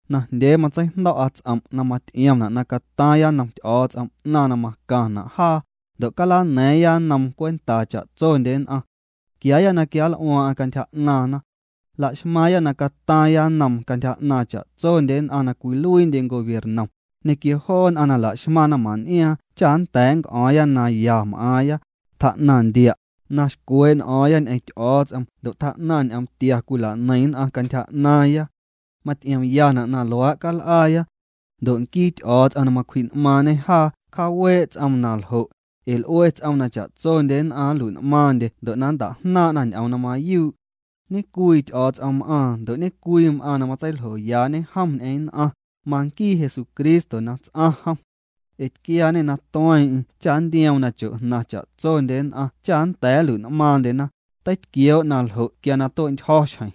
Najndyee matseijndo̱'a ts'om' na maty'iomna' na cataaⁿya nnom Ty'o̱o̱ts'om 'naⁿ na macaⁿna' jaa, ndo' calana̱a̱ⁿya nnoom cwentaa cha'tsondye nn'aⁿ. Quiaaya na quianl'uaaⁿ'aⁿ cantyja 'naaⁿna. Laxmaaⁿya na cataaⁿya nnoom cantyja 'naaⁿ cha'tsondye nn'aⁿ na cwiluiindye gobiernom, ñequio joo nn'aⁿ na laxmaⁿ naⁿmaⁿn'iaaⁿ cha nnda̱a̱ nnc'o̱o̱ⁿya na ya m'aaⁿya, tjaa'naⁿ ndia', na xcwee' n'o̱o̱ⁿya ñ'eⁿ Ty'o̱o̱ts'om ndo' tjaa'naⁿ ñ'oom tia cwila'neiⁿ nn'aⁿ cantyja 'naaⁿya. Maty'iomyana' na luaa' cal'aaya. Ndo' nquii Ty'o̱o̱ts'om na macwji'n'maaⁿñê jaa cjaawee' ts'oom na ljo', ee l'ue ts'oom na cha'tsondye nn'aⁿ nlui'n'maaⁿndye ndo' na nnta'jnaaⁿ'na ñ'oom na mayuu'. Ñecwii Ty'o̱o̱ts'om m'aaⁿ ndo' ñe'cwii m'aaⁿ na matseiljoyaañe jom ñ'eⁿ nn'aⁿ, manquii Jesucristo na ts'aⁿ jom. Ee tquiaañê na tueeⁿ'eⁿ cha ntioom na cho'jnaⁿ cha'tsondye nn'aⁿ cha nnda̱a̱ nlui'n'maaⁿndyena, teitquioo' na jo' quia na tue'ntyjo̱ xjeⁿ.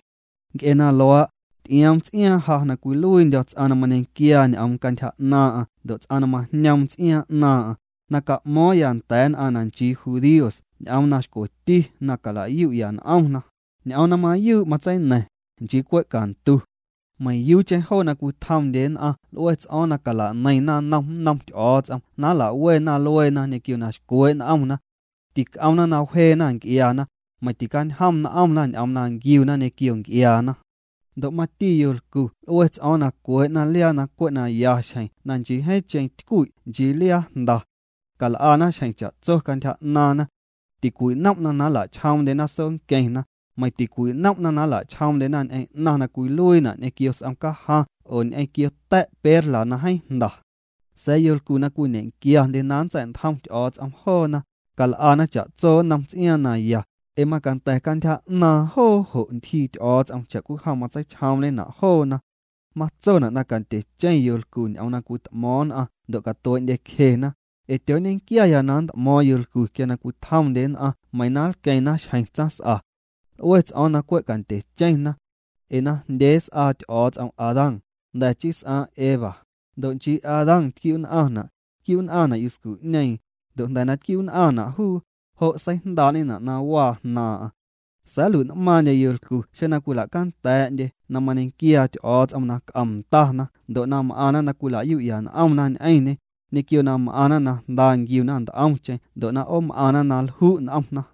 Nc'e na luaa', ty'ioom ts'iaaⁿ ja na cwiluiindyo̱ ts'aⁿ na mañequiaa ñ'oom cantyja 'naaⁿ'aⁿ ndo' ts'aⁿ na majñoom ts'iaaⁿ 'naaⁿ'aⁿ, na ca'mo̱o̱ⁿya nda̱a̱ nn'aⁿ na nchii judíos ñ'oom na xcweti na cala'yu'ya n'omna, ñ'oom na mayuu' matseina̱ⁿ, nchii cwe' cantu. Meiⁿyuucheⁿ joo na cwitjomndye nn'aⁿ l'ue ts'o̱o̱ⁿ cala'neiⁿ naⁿnom nnom Ty'o̱o̱ts'om na nlawena lueena ñequio na xcwee' n'omna. Tic'omna na wjeena nc'iaana, meiⁿ ticañjom n'omna ñ'oom na nquiuna ñequio nc'iaana. Ndo' mati yolcu l'ue ts'o̱o̱ⁿ na cwee'na liaa na cwe' na ya xjeⁿ na nchii jeeⁿcheⁿ tycwi' nchii liaa jnda. Cal'ana xjeⁿ cha'tso cantyja 'naaⁿna. Ticwinom'na' na nla'chjoomndyena soonqueⁿna, meiⁿ ticwinom'na' na nla'chjoomndyena ñ'eⁿ 'naⁿ na cwiluiina' ñequio s'om cajaⁿ oo ñequio ta̱' perla na jeeⁿ jnda. Sa̱a̱ yolcu na cwiñequiaandye na nntsa̱'ntjom Ty'o̱o̱ts'om joona, cal'ana cha'tso nnom ts'iaaⁿ na ya, ee macanda̱ cantyja 'naaⁿ joo jo' ntyjii Ty'o̱o̱ts'om cha'cwijom matseichjoomñena' joona. Matsona' na candyecheⁿ yolcu ñ'oom na cwit'mo̱o̱ⁿ nn'aⁿ ndo' na catuee'ndyecjena: ee tyooñequiaya na nnt'mo̱o̱ⁿ yolcu quia na cwitjomndye nn'aⁿ meiⁿ na nlqueⁿna xjeⁿ tsaⁿs'a. L'ue ts'o̱o̱ⁿ na cwe' candyecheⁿna. Ee najndyee s'aa Ty'o̱o̱ts'om Adán, jnda̱ chii s'aaⁿ Eva, ndo' nchii Adán tquiu'nn'aⁿna', tquiu'nn'aⁿna' yuscu'ñeeⁿ, ndo' jnda̱ na tquiu'nn'aⁿna' juu, jo' seijndaa'ñena' na waa jnaaⁿ'aⁿ. Sa̱a̱ nlui'n'maaⁿndye yolcu xeⁿ cwila'canda̱a̱'ndye na mañequiaa Ty'o̱o̱ts'om na c'om ndana ndo' m'aⁿna na cwila'yu'ya n'omna ñ'eⁿñê, ñequio na m'aⁿna na jnda nquiuna nt'omcheⁿ ndo' na 'oom'aⁿna na lju' n'omna.